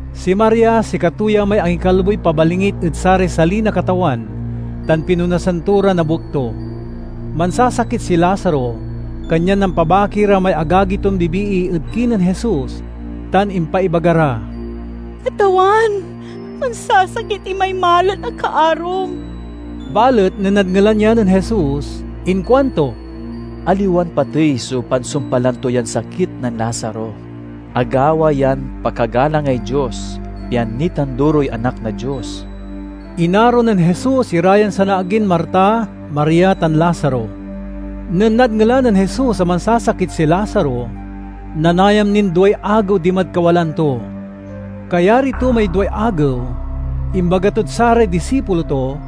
(Si Maria sikato ya may angikalboy pabalingit ed saray sali na Katawan tan pinonasan to ra na buek to.) Mansasakit si Lazaro, kanyan nampabaki ra may agagi ton bibii ed kinen Jesus tan impaibaga ra, "Katawan, mansasakit imay malet a kaarom." Balet nen nadngelan ya nen Jesus, inkuanto, "Aliwan patey so pansumpalan to yan sakit nen Lazaro. Agawa yan pakagalangay Dios, pian nitanduroy Anak na Dios." Inaro nen Jesus ira yan sanaagin Marta, Maria, tan Lazaro. Nen nadngelan nen Jesus a mansasakit si Lazaro, nanayam nin duay agew dimad kawalaan to. Kayari to may duay agew, imbaga tod saray disipulo to,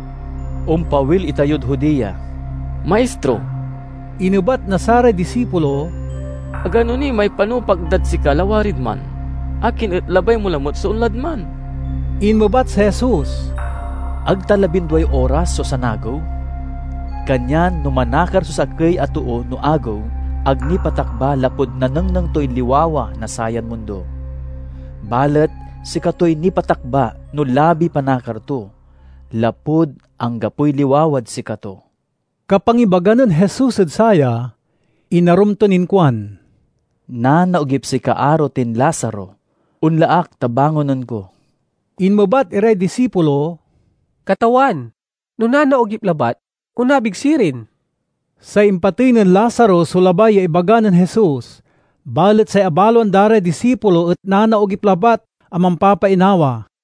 "Ompawil itayod Judea." "Maistro," inebat na saray disipulo, "agano ni may panupak dad sika lawarid man. Akin et labay mo lamet so onlad man?" Inmebat si Jesus, "Ag ta labinduay oras so sanagew? Kanyan no manakar so sakey a too no agew, ag nipatakba lapud nanengneng toy liwawa na sayan mundo. Balet sikatoy nipatakba no labiy panakar to, lapud anggapoy liwawad sikato." Kapangibaga nen Jesus ed saya, inarum ton inkuan, "Nanaogip si kaaro tin Lazaro. Onla ak ta bangonen ko." Inmebat iray disipulo, "Katawan, no nanaogip labat, onabig sirin." Say impatey nen Lazaro so labay ya ibaga nen Jesus, balet say abaloan da ray disipulo et nanaogip labat a mampapainawa.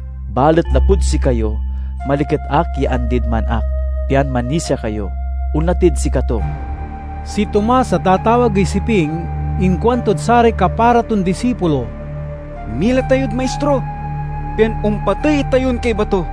Balet lapud sikayo maliket ak ya andid man ak, pian manisia kayo. Onla tid sikato." Si Tomas a tatawagey Siping inkuantod saray kapara ton disipulo, "Mila tayod Maistro, pian ompatey itayon kaiba to."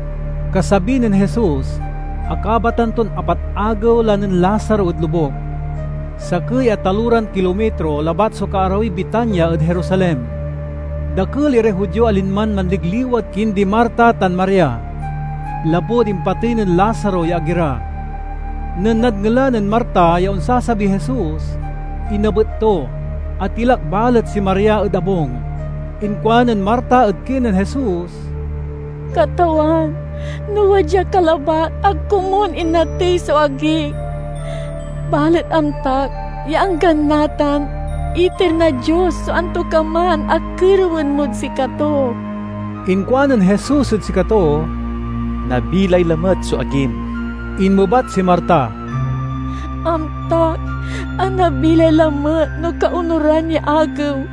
Kasabi nen Jesus, akabatan ton apat agew la nen Lazaro ed lobuk. Sakey a taloran kilomitro labat so kaarawiy Betania ed Jerusalem. Dakel iray Judio a linman manligliwa ed kindi Marta tan Maria, lapud impatey nen Lazaro ya agi ra. Nen nadngelan nen Marta ya onsasabiy Jesus, inabet to; atilak balet si Maria ed abung. Inkuanen Marta ed kinen Jesus, "Katawan, no wadya ka labat, ag komun inatey so agik! Balet amtak ya anggan natan, iter na Dios so antokaman a kerewen mod sikato." Inkuanen Jesus ed sikato, "Nabilay lamet so agim." Inmebat si Marta, "Amtak a nabilay lamet no kaonuran ya agew,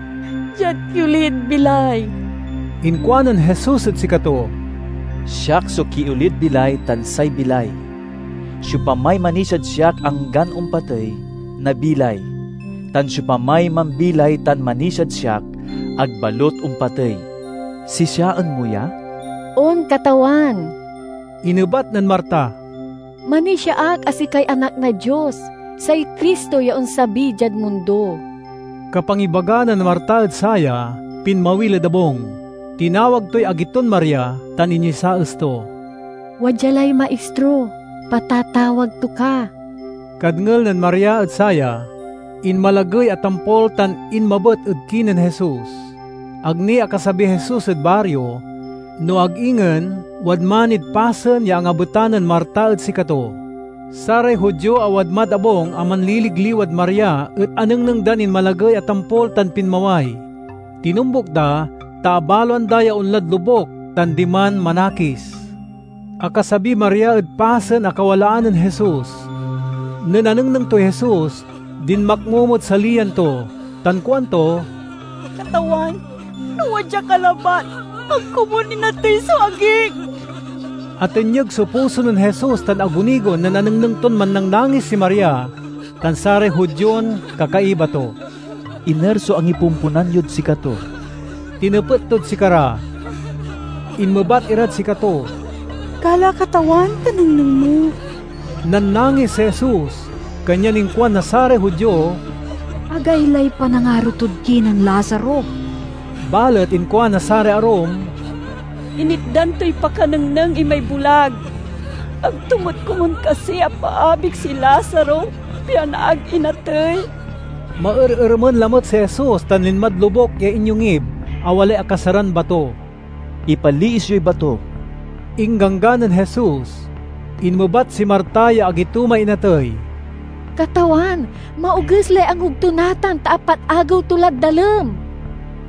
diad kiolid bilay." Inkuanen Jesus ed sikato, "Siak so kiolid bilay tan say bilay. Siopamay manisiad siak anggan ompatey, nabilay; tan siopamay mambilay tan manisiad siak, ag balut ompatey. Sisiaen mo ya?" "On, Katawan!" inebat nen Marta. "Manisia ak a sikay Anak na Dios, say Cristo ya onsabi diad mundo." Kapangibaga nen Marta ed saya, pinmawil ed abung. Tinawag toy agi ton Maria tan inyesaes to, "Wadya lay Maistro; patatawag to ka." Kadngel nen Maria ed saya, inmalagey a tampol tan inmabet ed kinen Jesus. (Ag ni akasabiy Jesus ed bario, no ag ingen wadman nid pasen ya angabetan nen Marta ed sikato.) Saray Judio a wadmad abung a manliligliwad Maria et anengneng dan inmalagey a tampol tan pinmaway. Tinombuk da, ta abaloan da ya onlad lobuk tan diman manakis. Akasabiy Maria ed pasen a kawalaan nen Jesus. Nen anengneng toy Jesus, dinmakmomod saliyan to, tan kuanto, "Katawan, no wadya ka labat, ag komun inatey so agik!" Atenyeg so puso nen Jesus tan agunigon nen anengneng ton mannangnangis si Maria tan saray Judion kakaiba to. "Iner so angipomponan yod sikato?" tinepet tod sikara. Inmebat irad sikato, "Gala Katawan, ta nengneng mo." Nannangis si Jesus, kanyan inkuan na saray Judio, "Agaylay panangaro tod kinen Lazaro!" Balet inkuan na saray arum, "Initdan toy pakanengneng imay bulag, ag to met komun kasi apaabig si Lazaro pian ag inatey?" Maerermen lamet si Jesus tan linmad lobuk ya inyongib a walay akasaran bato. "Ipaliis yoy bato!" ingganggan nen Jesus. Inmebat si Marta ya agi to may inatey, "Katawan, maoges lay angub to natan, ta apat agew to lad dalem!"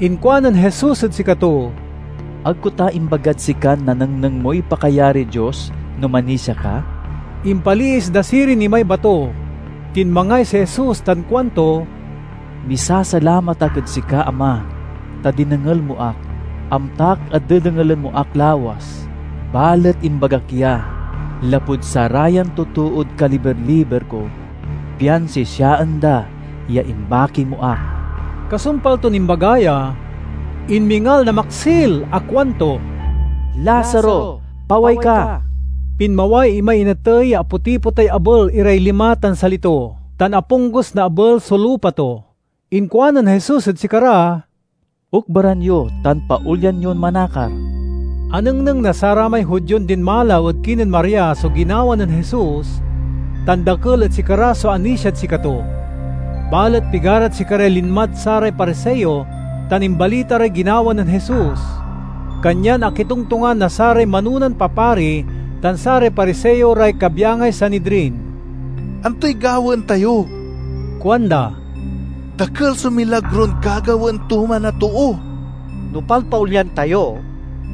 Inkuanen Jesus ed sikato, "Ag ko ta imbagad sikan nanengneng moy pakayariy Dios no manisia ka?" Impaliis da sirin imay bato. Tinmangay si Jesus tan kuanto, "Misalamat ak ed sika Ama, ta dinengel mo ak. Amtak a dedengelen mo ak lawas, balet imbagak ya lapud sarayan totood kaliber-liber ko, pian sisiaen da ya imbaki mo ak." Kasumpal ton imbaga ya, inmingal na maksil a kuanto, "Lazaro, paway ka!" Pinmaway imay inatey ya aputipotay abel iray lima tan sali to, tan aponggus na abel so lupa to. Inkuanen Jesus ed sikara, "Okbaran yo tan paolyan yon manakar." Anengneng na saramay Judion dinmalaw ed kinen Maria so ginawa nen Jesus, tan dakel ed sikara so anisiad sikato. Balet pigarad sikaray linmad saray Pariseo tan imbalita ray ginawa nen Jesus. Kanyan akitongtongan na saray manonan papari tan saray Pariseo ray kabyangay Sanidrin. "Antoy gawaen tayo?" kuanda. "Dakel so milagron gagawaen to man a too. No palpaolyan tayo,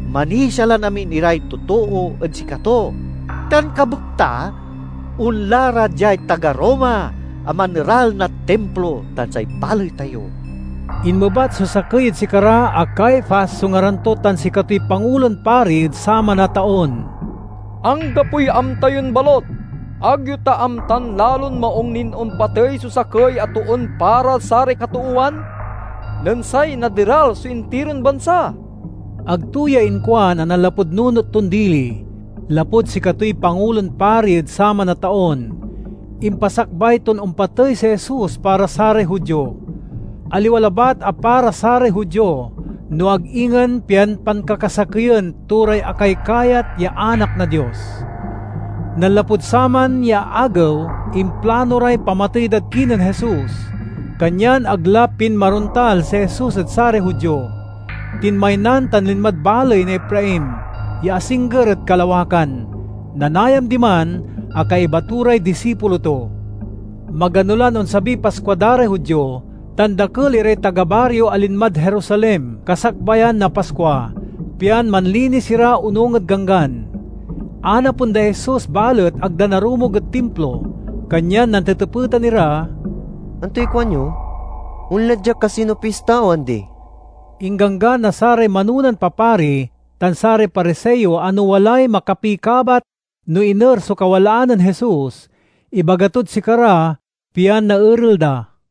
manisia lan amin iray totoo ed sikato tan kabekta, onla ra diay taga Roma a maneral na Timplo tan say baley tayo!" Inmebat so sakey ed sikara a Caifas so ngaran to tan sikatoy Pangulon Pari ed saman a taon, "Anggapoy amta yon balut! Ag yo ta amtan lalon maung nin ompatey so sakey a toon para saray katoowan, nen say naderal so intiron bansa?" (Ag to ya inkuan a nanlapud nunot ton dili. Lapud sikatoy Pangulon Pari ed saman a taon, impasakbay ton ompatey si Jesus para saray Judio. Aliwa labat a para saray Judio, no ag ingen pian pankakasakeyen to ray akaykayat ya anak na Dios.) Nanlapud saman ya agew, implano ray pamatey dad kinen Jesus. Kanyan ag la pinmarontal si Jesus ed saray Judio. Tinmaynan tan linmad baley na Efraim ya asingger ed kalawakan. Nanayam diman a kaiba to ray disipulo to. Magano lan onsabiy Paskua da ray Judio tan dakel iray taga bario a linmad Jerusalem kasakbayan na Paskua, pian manlinis ira onung ed Ganggan. Anapen day Jesus balet ag da narumog ed Timplo, kanyan nantetepetan ira, "Antoy kuanyo? Onla dia kasi no pista o andi?" Ingganggan na saray manonan papari tan saray Pariseo a no walay makapikabat no iner so kawalaan nen Jesus, ibaga tod sikara pian naerel da.